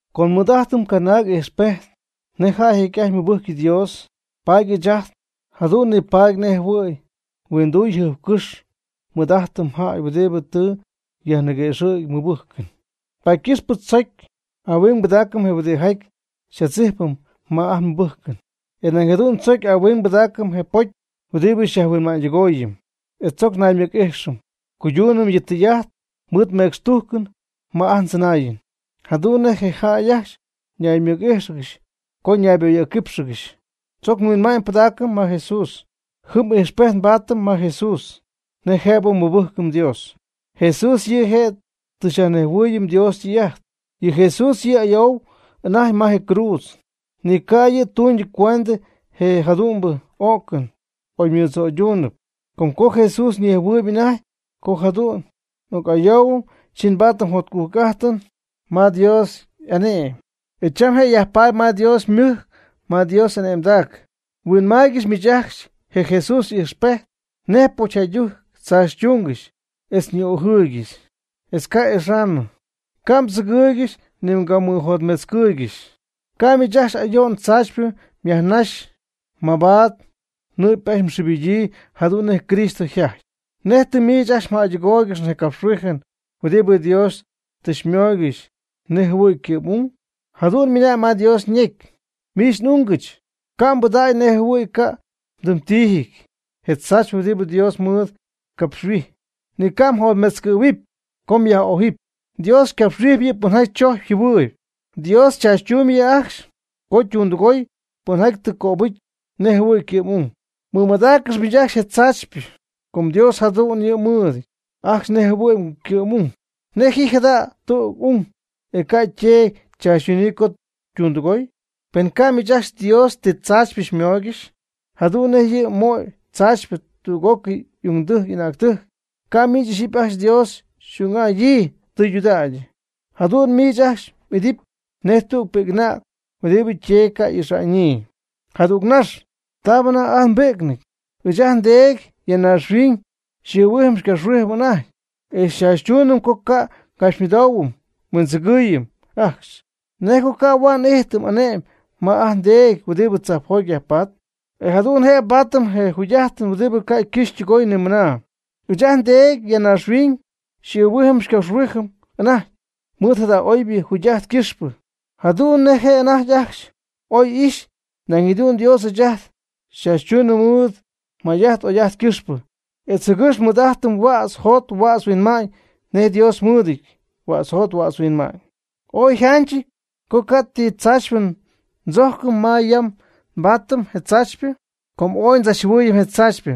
Com nmɨɨd'ajtɨm canaag ijxpejt nej jäy jecy'ajty mɨbɨjcy Dios, paady ɨɨch ajt jadu'n nipaady nej jɨhuɨ̈y huinduy jajɨɨxcɨ'py nmɨɨd'ajtɨm jäy huɨdibɨ tɨ yajniguëxɨ̈gy ymɨbɨjcɨn. Paady ycɨxp tzoc ahuing pɨdaacɨm je huɨdijaty xy'adzijpɨm ma ajt nmɨbɨjcɨn, e nañ jadu'n tzoc ahuing pɨdaacɨm je pocy huɨdibɨ xyajhuinma'ñydɨgooyɨm, e tzoc naymɨc'ijxɨm cuydunɨm yɨ tɨy'ajt mɨɨd mecxtujcɨn ma ajt ndzɨnaayɨn, jadu'n nej jäy ñaymɨc'íjxɨgɨxy co nayboyɨ̈cquípxɨgɨxy. Tzoc nhuinma'ñybɨdaacɨm ma Jesús. Jɨm ijxpejt nbaatɨm ma Jesús nej jëbɨ nmɨbɨjcɨm Dios. Jesús yɨ' je' tɨ xyajnejhuɨɨyɨm Dios ytɨy'ajt. Yɨ Jesús yɨ' y'ayoo anajty ma je cruudz, ni ca' yɨ' tuñcuendɨ je jadu'mbɨ o'cɨn oymɨdzo'yduunɨp. Com co Jesús ñejhuɨɨyb anajty co jadu'n y'oc'ayoohuɨpy, chi ypaadɨpy jotcujc'ajtɨn ma Dios y'ane'my. E cham je' yajpaady ma Dios ymɨjc ma Dios y'ane'mdac. Huinmaaygɨxy miich ajcxy je Jesús y'ijxpejt, nej pocyjäydɨjc chaachytuungɨxy etz ñi'ojɨɨygɨxy, etz ca' y'ixaanɨ, paady ca' mdzíjpcɨgɨxy ni mgamɨjotmetzcɨɨygɨxy. Ca'nɨ miich ajcxy ayo'n tzaachypɨ myajnaxy mabaad nɨ'py ajcxy mxɨɨbɨdyii jadu'n nej Cristo yjajty. ¿Nej tɨ miich ajcxy mjäydɨgooygɨxy je capxhuijɨn huɨdibɨ Dios tɨ xymooygɨxy nej jɨhuɨ̈y ycɨ'm'ung? Jadu'n ymɨna'ñ ma Dios ñecy: Miich n'ungɨch, ca' mbɨdägy nej jɨhuɨ̈y ca' ytɨm ytiijɨty je tzaachypɨ huɨdibɨ Dios mɨɨd xycapxhuijy, ni ca' mjotmetzcɨ̈huɨpy co xyaj'ójɨpy. Dios ycapxhuijpy yɨ' pɨnjaty chojcpy yjɨhuɨɨyb. Dios chaachytumby yɨ' ajcxy co ytundɨgooy, pɨnjaty yɨ' tɨ cöbɨcy nej jɨhuɨ̈y ycɨ'm'ung. Mɨmadaaccɨx miich ajcxy je castigo, com Dios jadu'n yɨ' xymɨɨdɨty ajcxy nej jɨhuɨ̈y ycɨ'm'ung. ¿Nej ji jada' tüg ung, e ca' yteedy chaachytunɨɨyb co ytundɨgooy? Pen ca' miich ajcxy Dios ti tzaachypɨ xymooygɨxy, jadu'n nej yɨ' moy castigo tüg'ócɨy y'ungdɨjc y'anäctɨjc, ca' miich ixyipy ajcxy Dios xy'ung'adyii tɨydudägy. Jadu'n miich ajcxy m'idɨpy nej tüg pi'c'anäg huɨdibɨ yteedy ca' y'ixa'ñyii. Jadüg nax, taabɨ anajty ajt nbi'cnɨty, ɨɨch ajt ndeedy ya naaxhuiñ xy'ɨɨhuijɨm xycapxhuijɨm anajty, e xychaachytuunɨm co ca' ngapxymɨdoohuɨm nhuindzɨgɨɨyɨm ajcxy. ¿Nej co ca' huaad n'ijtɨm ane'my ma ajt ndeedy huɨdibɨ tzajpjoty yajpatp? E jadu'n jëbɨ nbaatɨm je jugy'ajtɨn huɨdibɨ ca' ycɨxɨpy ytɨgoyɨpy nimɨna. Ɨɨch ajt ndeedy ya naaxhuiñ xy'ɨɨhuijɨm xycapxhuijɨm anajty mɨɨd jada conbɨ jugy'ajt ycɨxpɨ, jadu'n nej je' anajty ajcxy oy'ixy. Nañ jadu'n Dios ɨɨch ajt xychaachytuunɨm mɨɨd ajt n'oy'ajt ycɨxpɨ etz jɨgɨx nmɨɨd'ajtɨm huädz jot huädz huinma'ñ nej Dios ymɨɨdɨty huädz yjot huädz yhuinma'ñ. Oy yjanchɨty co ca' ti tzaachypɨ ndzojcɨm ma yam nbaatɨm je tzaachypɨ, com ooy ndzachjɨhuɨɨyɨm je tzaachypɨ,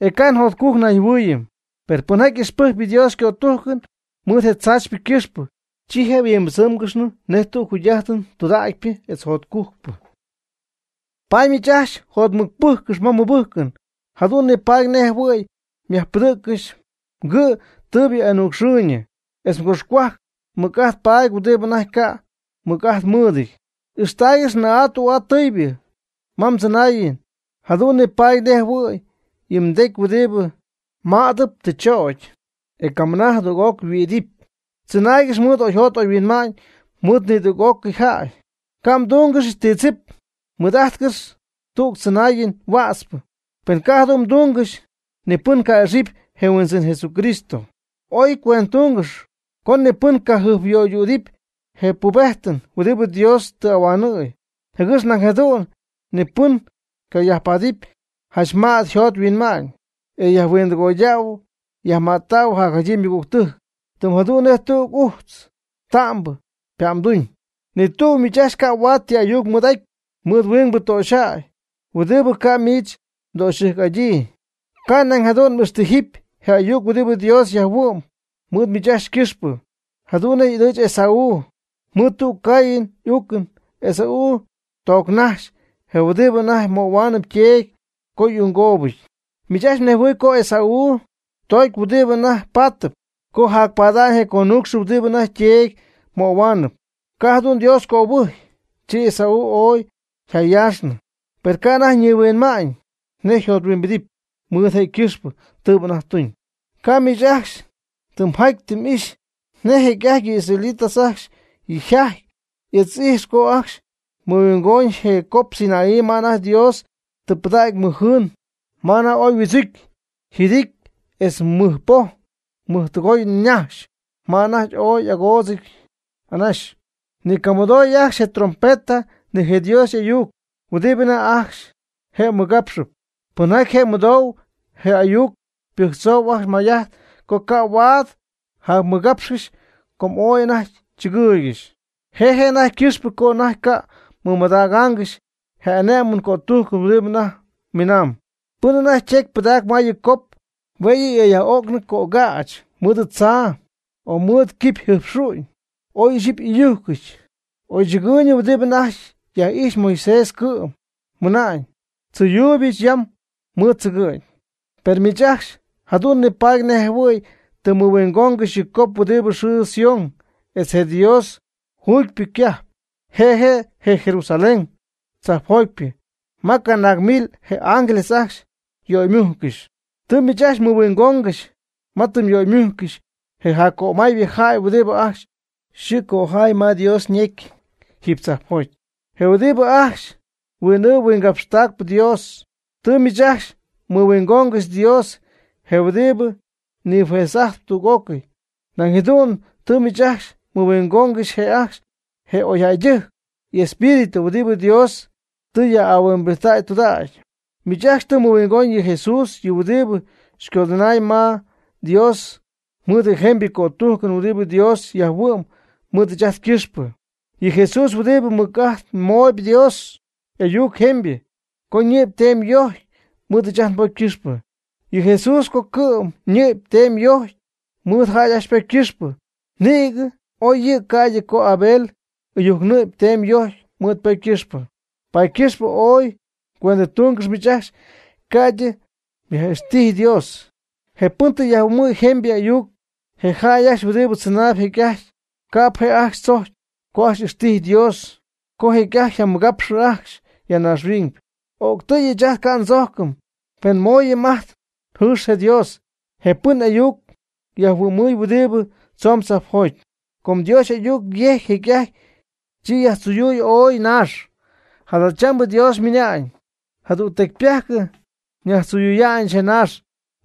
e ca' jotcujc nayjɨhuɨɨyɨm. Per pɨnjaty ixpɨjcpɨ Dios chojcɨn mɨɨd je tzaachypɨ ycɨxpɨ, chi je' yhuimbɨdzɨmɨɨygɨxy tüg jugy'ajtɨn tüdägypɨ etz jotcujcpɨ. Paady miich ajcxy jotmɨcpɨjccɨx ma mmɨbɨjcɨn, jadu'n nipaadɨp nej jɨhuɨ̈y myajpɨdɨ̈ccɨxy mgɨ' tɨɨbɨ y'anucxɨɨyñɨ, etz mgoxcohuajc mɨc'ajt paady huɨdibɨ anajty ca' mɨc'ajt mɨɨdɨty. Ixtaaygɨx nɨɨ'aa tü'aa tɨɨybɨ ma mdzɨnaayɨn, jadu'n nipaadɨp nej jɨhuɨ̈y yɨ mdecy huɨdibɨ mädɨp tɨ chögy, e camɨna jadüg'oc yhuiidɨp. Tzɨnaaygɨx mɨɨd oyjot oyhuinma'ñ mɨɨd nidüg'ócɨy jäy. Ca' mdúngɨxɨpy ti tzip. Mɨɨd'ajtcɨx tüg tzɨnaayɨn huätzpɨ, pen ca' jadu'n mdungɨxy, ni pɨn ca'ixɨpy je Huindzɨn Jesucristo. Ooy cuendɨtungɨxp co ni pɨn cajɨjpyöydüdɨpy je pubejtɨn huɨdibɨ Dios tɨ ahuanɨ̈y, jɨgɨx nañ jadu'n ni pɨn ycayajpaadɨpy janch mät yjot yhuinmañ, e yajhuindɨgoydäy yajmättäy jacjadyii ymɨgügtɨjc, tɨm jadu'n nej tüg ujtz ta'mbɨ ypa'mduñ. Ni tüg miich ajcxy ca' huaad ti ayuc mɨɨd'aty mɨɨd huingbɨ töxyjäy huɨdibɨ ca' miich mdöxyɨjc'adyii. Ca' nañ jadu'n m'ixtijɨpy je ayuc huɨdibɨ Dios yajhuɨ'my mɨɨd miich ajcxy ycɨxpɨ, jadu'n nej y'ɨdɨɨch Esaú. Mɨɨd tüg caayɨn uucɨn Esaú toocnax je huɨdibɨ anajty möhuaanɨp yteedy co y'unggoobɨty. Miich ajcxy mnejhuɨɨyb co Esaú tocy huɨdi anajty paatɨp co japada'ñ je conuucxɨn huɨdibɨ anajty yteedy möhuaanɨp, ca' jadu'n Dios cöbɨjcy, chi Esaú ooy yjayaaxnɨ, per ca' anajty ñihuinma'ñ nej yjothuimbidɨp mɨɨd je' ycɨxpɨ tɨɨbɨ anajty tuñ. Ca' miich ajcxy tɨ mjaty tɨ m'ixy, nej jecy'ajty yɨ israelitas ajcxy yjajty etz y'ixy co ajcxy mɨhuingoñ je cop Sinaí ma anajty Dios tɨ pɨdägy mɨj jɨɨn, ma anajty ooy yhuɨdzucy yjɨdity etz mɨjpoj mɨjtɨgoy ñaxy, ma anajty ooy y'agoodzɨ̈y anaxy. Ni mgamɨdoy ajcxy je trompeta ni je Dios y'ayuc huɨdibɨ anajty ajcxy je' mɨgapxɨp. Pɨnjaty je' mɨdou je ayuc ypɨjctzou ajcxy may'ajt co ca' huaad yjacmɨgápxɨgɨxy com ooy anajty chɨgɨɨygɨxy. Je' je' anajty ycɨxpɨ co anajty ca' mɨmadägaangɨxy je ane'mɨn cötujcɨn huɨdibɨ anajty mɨnamb: “Pɨn anajty ytecy pɨdacp ma yɨ cop, hue' yɨ' y'oyyaj'o'cnɨty cögäch mɨɨd tzaa o mɨɨd quipyjɨjpxu'ñ, oy ixyipy y'ɨyujcɨty.” Oy chɨgɨɨyñɨ huɨdibɨ anajty yaj'ijxp, Moisés cɨ'm mɨnaan: “Tzɨyuuybɨch yam mɨɨd tzɨgɨ'ñ.” Per miich ajcxy jadu'n nipaady nej jɨhuɨ̈y tɨ mmɨhuingoongɨxy yɨ cop huɨdibɨ yxɨɨ Sión etz je Dios juugypɨ ycajp. Je' je' je Jerusalén tzajpjotypɨ ma canaag mil je ángeles ajcxy yöymujccɨxy. Tɨ miich ajcxy mmɨhuingoongɨxy ma tɨ yöymujccɨxy je jaccömaaybɨ jäy huɨdibɨ ajcxy yxɨɨ cojaay ma Dios ñecy jiiby tzajpjoty, je huɨdibɨ ajcxy huin'ɨɨb huingapxtacp Dios. Tɨ miich ajcxy mɨhuingoongɨxy Dios je huɨdibɨ nijuez'ajtp tüg'ócɨy. Nañ jadu'n tɨ miich ajcxy mɨhuingoongɨxy je' ajcxy je oyjäydɨjc y'espíritu huɨdibɨ Dios tɨ yaj'ahuimbijttäy tudägy. Miich ajcxy tɨ mɨhuingoñ yɨ Jesús, yɨ huɨdibɨ xycodɨnaayɨm ma Dios mɨɨd je jemybɨ cötujcɨn huɨdibɨ Dios yajhuɨ'my mɨɨd ɨɨch ajt ycɨxpɨ. Yɨ Jesús huɨdibɨ mɨc'ajtmoy je Dios y'ayuc jemybɨ, co ñɨ'py teemy yojcy mɨɨd ajt nbocy ycɨxpɨ. Yɨ Jesús co cɨ'm ñɨ'py teemy yojcy mɨɨd jäy ajcxy ypocy ycɨxpɨ, nïgɨ oy yɨ' ca'ydɨ co Abel ɨyujc ñɨ'py teemy yojcy mɨɨd ypocy ycɨxpɨ. Paady ycɨxp ooy cuendɨtungɨx miich ajcxy, ca'ydɨ yaj'ixtijy Dios, je pɨn tɨ xyajmɨhuɨ'mɨm jemybɨ y'ayuc. Je jäy ajcxy huɨdibɨ tzɨnay jecy'ajty, ca'p je' ajcxy chocy co ajcxy ixtijy Dios co jecy'ajty yjamɨgapxɨ ajcxy ya naaxhuiñ. O'ctɨ́y ɨɨch ajt ca' ndzoocɨm, pen nmooyɨm ajt njɨɨx je Dios, je pɨn y'ayuc xyajmɨhuɨ'mɨm huɨdi tzoon tzajpjoty. Co Dios y'ayuc yejcy jecy'ajty, chi yajtziyuuy ooy naax. Jadachambɨ Dios ymɨna'ñ: “Jadügtecypajc nyajtziyuya'ñɨch je naax,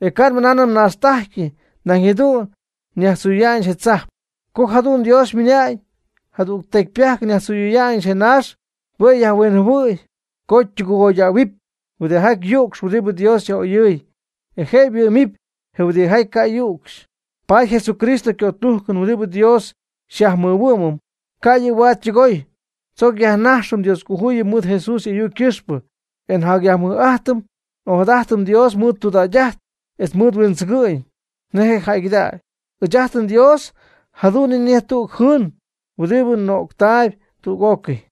e ca' nmɨnaanɨm naaxtɨ'ajty, nañ jadu'n nyajtziyuya'ñɨch je tzajp.” Co jadu'n Dios ymɨna'ñ: “Jadügtecypajc nyajtziyuya'ñɨch je naax.” Hue' yajhuinjɨhuɨ̈y co ytɨgoydähuɨpy huɨdijaty yücxp huɨdibɨ Dios yaj'oyɨɨy, e je' huɨ'mɨp je huɨdijaty ca' yu'cxy. Paady je Jesucristo ycötujcɨn huɨdibɨ Dios xyajmɨhuɨ'mɨm, ca' yɨ' huaad ytɨgoy. Tzoc yajnajxɨm Dioscojuyip mɨɨd Jesús y'ayuc ycɨxpɨ, e nyajmɨj'ajtɨm n'ojadajtɨm Dios mɨɨd tudägy'ajt etz mɨɨd huindzɨgɨ'ñ nej je' jäygɨdägyɨn. Ɨɨch ajt nDios jadu'n yɨ' nej tüg jɨɨn huɨdibɨ nöctaayb tüg'ócɨy.